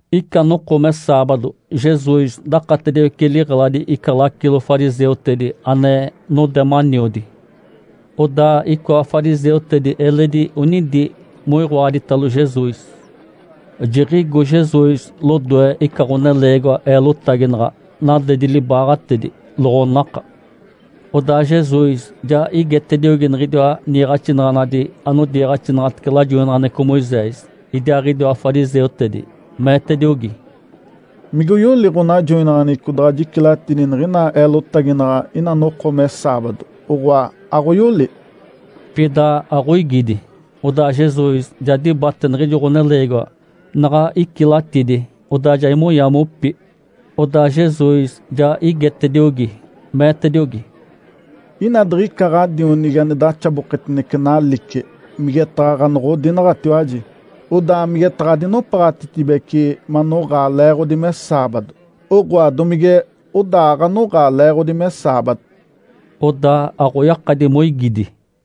Ica noko me saabado, Jesus dakatediwece liɡ̶eladi ica lacilo fariseutedi ane node maniodi. Odaa icoa fariseutedi eledi onidi moiɡ̶oaditalo Jesus. Jiɡ̶igo Jesus lodoe ica ɡ̶oneleegiwa eelotaginaɡ̶a, nadedi libaaɡ̶atedi, loɡ̶onaka. Odaa Jesus ja igetediogi niɡ̶idiwa niiɡ̶axinaɡ̶anadi anodiiɡ̶axinaɡ̶atece lajoinaɡ̶aneɡ̶eco Moisés, idiaaɡ̶idiwa fariseutedi, meetediogi, “Mige oyoli ɡ̶onajoinaɡ̶aneɡ̶eco daɡ̶a jicilatidi niɡ̶ina eelotaginaɡ̶a ina noko me saabado, oɡ̶oa, aɡ̶oyoli?” Pida aɡ̶oigidi. Odaa Jesus ja dibate niɡ̶ijo ɡ̶oneleegiwa. Naɡ̶a icilatidi, odaa ja imonya mopi. Odaa Jesus ja igetediogi, meetediogi, “Ina diɡ̶ica ɡ̶adionigi ane daxaboketinece nalice, migetaɡ̶a ɡ̶anoɡ̶odinaɡ̶atiwaji, odaa migetaɡ̶a adinopaɡ̶atitibece manoɡ̶aa leeɡ̶odi me saabado? Oɡ̶oa domige odaa aɡ̶anoɡ̶aa leeɡ̶odi me saabado?” Odaa aɡ̶oyakadi moigidi.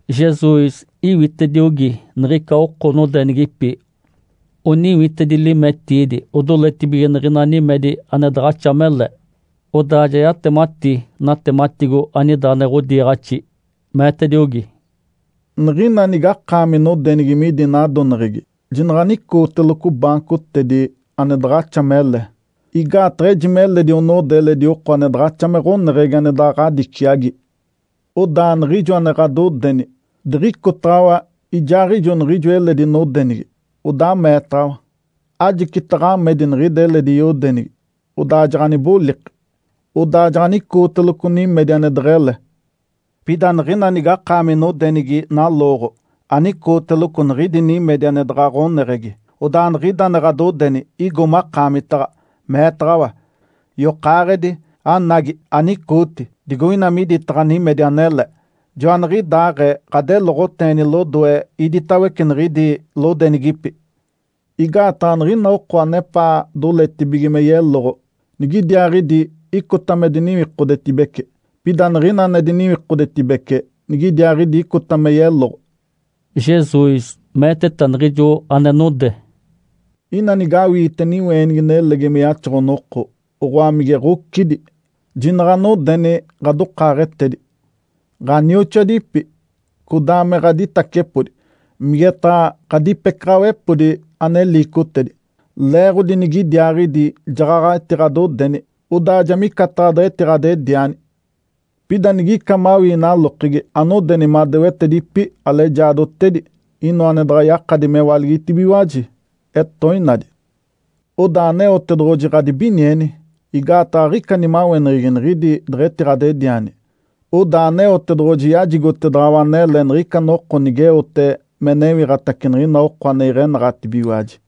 Jesus iwitediogi niɡ̶ica oko nodenigipi oniwitedi limetiidi odoletibige niɡ̶ina nimedi ane daɡ̶axa mele. Odaa ja yatemati natematigo anida ane ɡ̶odiiɡ̶axi, meetediogi, “Niɡ̶ina nigakaami nodenigi midi nadoneɡ̶egi, jinaɡ̶anicooteloco baancotedi ane daɡ̶axa mele. Igaataɡ̶a eji meledi onode eledi oko ane daɡ̶axa me ɡ̶oneɡ̶egi ane daɡ̶a ɡ̶adiciagi. Odaa niɡ̶ijo ane ɡ̶adodeni, diɡ̶icotaɡ̶awa ijaaɡ̶ijo niɡ̶ijo eledi nodenigi, odaa meetaɡ̶awa, ‘Ajicita ɡ̶amedi niɡ̶ida eledi yodenigi.’ Odaa jaɡ̶aniboliki, odaa jaɡ̶anicooteloco nimedi ane deɡ̶ele. Pida niɡ̶ina nigakaami nodenigi nalooɡ̶o, anicooteloco niɡ̶idi nimedi ane daɡ̶a ɡ̶oneɡ̶egi. Odaa niɡ̶ida ane ɡ̶adodeni igo makaamita, meetaɡ̶awa, ‘Yokaaɡ̶edi, anagi, anicooti digoina miditaɡ̶a nimedi anele.’ Joaniɡ̶idaaɡ̶ee ɡ̶adeloɡ̶oteeni lodoe iditawece niɡ̶idi lodenigipi. Igaataɡ̶a niɡ̶ina oko anepaa doletibige me yeloɡ̶o, nigidiaaɡ̶idi icota me diniwikodetibece. Pida niɡ̶ina ane diniwikodetibece, nigidiaaɡ̶idi icota me yeloɡ̶o.” Jesus meeteta niɡ̶ijo ane node, “Ina nigawiite niweenigi nelegi me yaxoɡ̶o-noko, oɡ̶oa, mige ɡ̶ocidi, jinaɡ̶anodeni ɡ̶adokaaɡ̶etedi, ɡ̶anioxoadipi, codaa me ɡ̶aditacepodi, migetaɡ̶a ɡ̶adipecaɡ̶awepodi ane liicotedi. Leeɡ̶odi nigidiaaɡ̶idi jaɡ̶aɡ̶a etiɡ̶adodeni, odaa ja micataɡ̶a deɡ̶etiɡ̶adediani. Pida nigica mawii nalokegi, anodeni madewetedipi, alejaadotedi, inoa ane daɡ̶a yakadi mewaligitibigiwaji, etoinadi. Odaa Aneotedoɡ̶oji ɡ̶adibinieni. Igaataɡ̶a aɡ̶ica nimaweneɡ̶egi niɡ̶idi deɡ̶etiɡ̶adediani. Odaa Aneotedoɡ̶oji yajigotedaɡ̶awa anele niɡ̶ica noko nigeote me newiɡ̶atace niɡ̶ina oko ane iɡ̶enaɡ̶atibigiwaji.”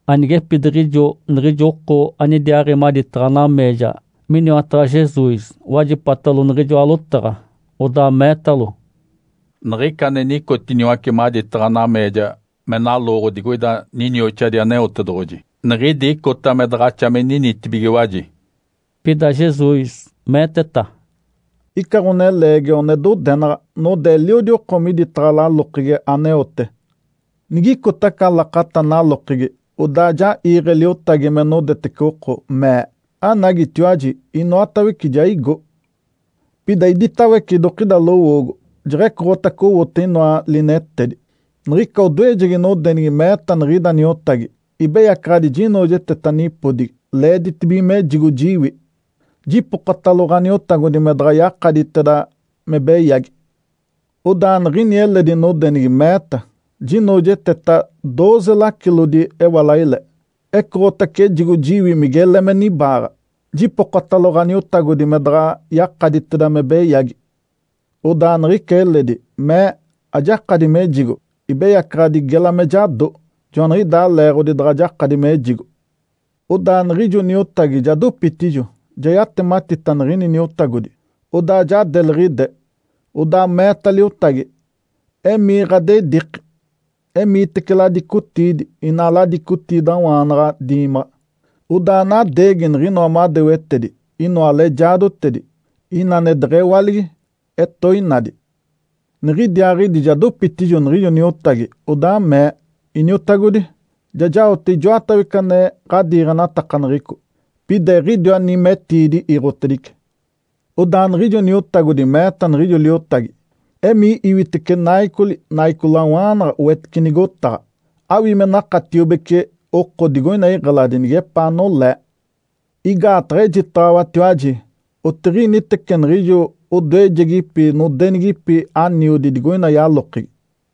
Anigepidiɡ̶ijo niɡ̶ijo oko anidiaaɡ̶i maditaɡ̶a nameeja miniwataɡ̶a Jesus wajipatalo niɡ̶ijoa lotaɡ̶a, odaa meetalo, “Niɡ̶ica ane nicotiniwace maditaɡ̶a nameeja me nalooɡ̶o digoida ninioxadi Aneotedoɡ̶oji, niɡ̶idi icota me daɡ̶axa me ninitibigiwaji.” Pida Jesus meeteta, “Ica ɡ̶oneleegiwa one dodenaɡ̶a node eliodi oko miditaɡ̶a lalokegi aneote. Niɡ̶icota aca lakata nalokegi, odaa ja iiɡ̶e liotagi me nodetece oko, mee, ‘Anagitiwaji, inoatawece ja igo.’ Pida iditawece idokida lowoogo, jeɡ̶ecoɡ̶otace owote inoa linetedi. Niɡ̶ica odoejegi nodenigi meeta niɡ̶ida niotagi, ‘Ibeyacaɡ̶adi jinoojeteta nipodigi, leeditibige mejigo jiwi. Jipokotalo ɡ̶aniotagodi me daɡ̶a yakaditeda me beyagi.’ Odaa niɡ̶ini eledi nodenigi meeta, ‘Jinoojeteta dooze lacilodi ewalaile. Ecoɡ̶otace ejigo jiwi migele me nibaaɡ̶a. Jipokotalo ɡ̶aniotagodi me daɡ̶a yakaditeda me beyagi.’ Odaa niɡ̶ica eledi mee, ‘Ajakadi mejigo, ibeyacaɡ̶adi gela me jado. Joaniɡ̶idaa leeɡ̶odi daɡ̶a jakadi mejigo.’ Odaa niɡ̶ijo niotagi ja dopitijo, ja yatematita niɡ̶ini niotagodi, odaa ja deliɡ̶ide. Odaa meeta liotagi, ‘Emii ɡ̶adediiki, emiitece ladicotiidi, ina ladicotiidawaanaɡ̶a diimaɡ̶a, odaa anadeegi niɡ̶inoa madewetedi, inoa alejaadotedi, ina ane deɡ̶ewaligi, etoinadi.’ Niɡ̶idiaaɡ̶idi ja dopitijo niɡ̶ijo niotagi, odaa mee, ‘Iniotagodi, ja jaote ijoatawece ane ɡ̶adiiɡ̶enatakaneɡ̶eco, pida eɡ̶idiwa nimetiidi iiɡ̶otedice.’ Odaa niɡ̶ijo niotagodi meeta niɡ̶ijo liotagi, ‘Emii iwitece naicoli, naicolawaanaɡ̶a wetice nigotaɡ̶a. Awii me nakatiobece oko digoina iɡ̶eladi nigepaa nolee. Igaataɡ̶a ejitaɡ̶awatiwaji, otiɡ̶initece niɡ̶ijo odoejegipi nodenigipi aniodi digoina yalokegi.’”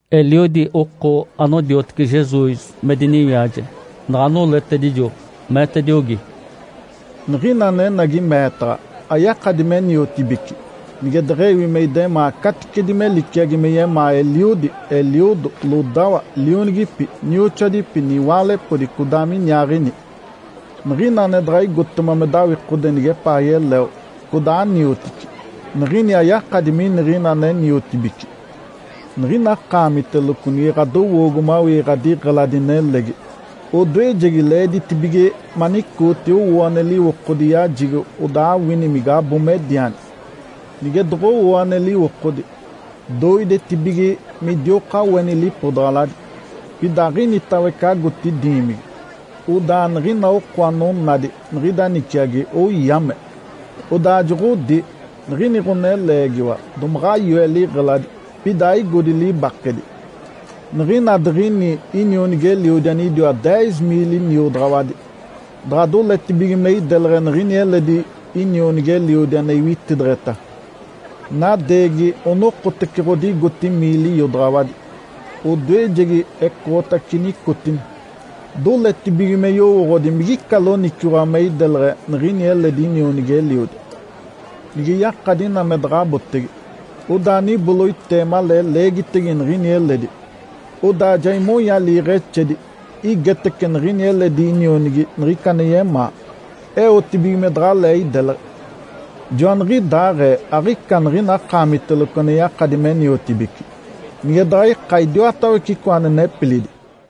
Eliodi oko anodiotece Jesus me diniwiaje, naɡ̶a noletedijo, meetediogi, “Niɡ̶ina anenagi meetaɡ̶a, ayakadi me niotibici, nige deɡ̶ewi me idemaa caticedi me liciagi me yemaa eliodi, eliodo, lodawa, lionigipi, nioxoadipi, niwaalepodi, codaa miniaaɡ̶ini. Niɡ̶ina ane daɡ̶a igotema me dawikode nigepaa yeleo, codaa aniotici, niɡ̶ini ayakadi miniɡ̶ina ane niotibici. Niɡ̶ina akaamiteloco nige ɡ̶adowoogo mawii ɡ̶adiɡ̶eladi nelegi, odoejegi leeditibige manicooti owoo ane liwokodi yajigo odaa awini migabo mediani. Nige doɡ̶owoo ane liwokodi, doidetibige me idioka oeni lipodaɡ̶aladi, pida aɡ̶initawece agoti diimigi. Odaa niɡ̶ina oko anonadi niɡ̶ida niciagi oyame. Odaa joɡ̶odi, ‘Niɡ̶ini ɡ̶oneleegiwa domaɡ̶a yoe liɡ̶eladi, pida aigodi libakedi.’ Niɡ̶ina diɡ̶ini inionigi-eliodi anidiwa deez miili niodaɡ̶awadi daɡ̶a doletibige me ideleɡ̶e niɡ̶ini eledi inionigi-eliodi ane iwitideɡ̶eta, nadeegi onokotece ɡ̶odigoti miili iodaɡ̶awadi. Odoejegi ecoɡ̶otace nicotini, doletibige me yowooɡ̶odi migica loniciwaɡ̶a me ideleɡ̶e niɡ̶ini eledi inionigi-eliodi. Nige yakadi ina me daɡ̶a abotege, odaa niboloitee malee leegitege niɡ̶ini eledi, odaa ja imonya liiɡ̶exedi igetece niɡ̶ini eledi inionigi niɡ̶ica ane yemaa eotibige me daɡ̶alee ideleɡ̶e. Joaniɡ̶idaaɡ̶ee aɡ̶ica niɡ̶ina akaamiteloco ane yakadi me niotibici nige daɡ̶a ika idiwatawece icoa ane nepilidi.”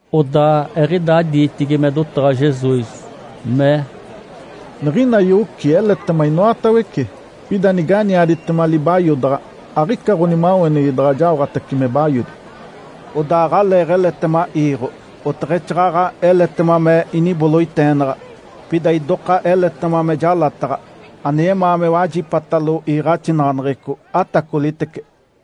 Odaa eɡ̶idaa diitigi me dotaɡ̶a Jesus, mee, “Niɡ̶ina yoci eletema inoatawece, pida niganiaditema libayodaɡ̶a, aɡ̶ica ɡ̶onimaweneɡ̶egi daɡ̶a jaoɡ̶atace me bayodi. Odaa aɡ̶aleeɡ̶eletema iiɡ̶o, oteɡ̶exaaɡ̶aɡ̶a eletema me iniboloiteenaɡ̶a, pida idoka eletema me jalataɡ̶a. Ane yemaa me wajipatalo iiɡ̶axinaɡ̶aneɡ̶eco, atacolitece!”